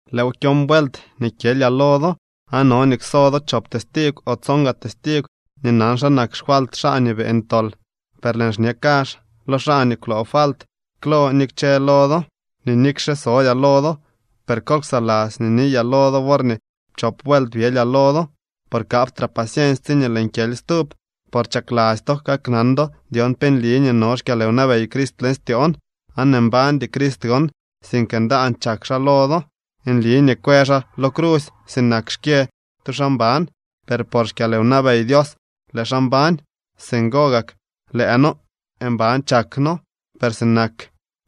Lëëw kyon vuelt nii kyelyaa lo do. Aan no nii kso do chop testigw o tson gaa testigw nii nan xa nak xfalt xaa nii beeñ tol. Per lëën xñe kazh lo xaa nii kwloo falt klo ni kchë lo do, nii nikxe sodyaa lo do, per kol ksaladzy nii niyaa lo do worñee pchop vuelt byelyaa lo do. Por kaptraa paciensy tsiñee lëën kyely stub. Por chakladzy to kaknan do dyon pe nli nii no xkyalwnabey Crist leñ styoon. Aan mbandy Crist gon, sink ndaan chak xaa lo do. Nli nii kwë xaa lo crusy sinak xkyë tu xaa mban, per por xkyalwnabey Dios lëë xaa mbañ. Singo gak lëë noo mban chak noo. Per sinak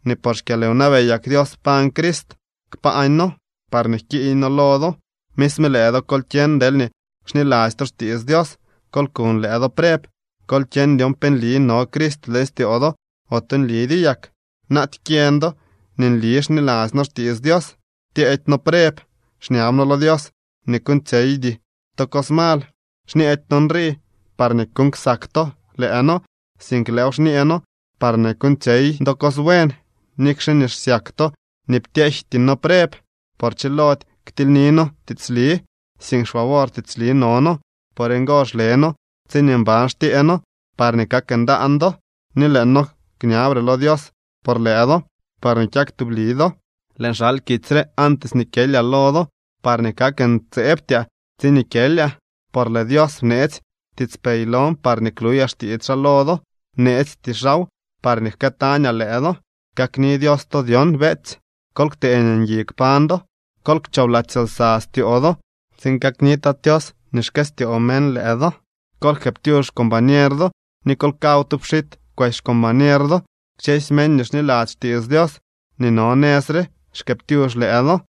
nii por xkyalwnabeyak Dios pañ Crist, kpañ noo, parñee jkiiñ noo lo do. Misme lëë do kol kyeñ deelñee nli xniladzy to xtiits Dios. Kol kuñ lëë do preb. Kol kyeñ dyon pe nli no Crist leñ styoo do, ote nlidyo yak. Naaty kyeñ do nii nli xniladzy noo xtiits Dios. Ptyeedy noo preb. Xñab noo lo Dios nii kuuñtsyeydy to cos mal. Xñeedy noo nrii parñee kuuñ ksak to lëë noo, sink lëëw xñee noo parñee kuuñtsyey do cos buen, nikxe nii xsyak to nii ptyejty noo preb. Por chilody ktilyni noo tiitsli, sink xfavor tiitsli no noo. Por ngo xle noo tsiñee mban xtyee noo parñee kak ndaan do, ni lëë noo kñabre lo Dios por lëë do parñee kyak tubli do. Lëën xal kitsy re antes nii kyelyaa lo do parñee kak ntseebtyaa tsiñee kyelyaa. Por lëë Dios bneetsy tiitspey lon parñee kluyaa xtiits xaa lo do. Bneesty xaaw parñee jkëëtañaa lëë do. Kakni Dios to dyon, beetsy. Kol ktee nii ngui kpañ do. Kol kchoobladzy lsa styoo do tsiin kakni Tat Tios nii xkëstyoo meñ lëë do. Kol jkëëptyux xcombañer do ni kol kaw tu pxit kwesy xcombañer do. Kchësy meñ nii xniladzy xtiits Dios nii no nëz re xkëëptyux lëë do.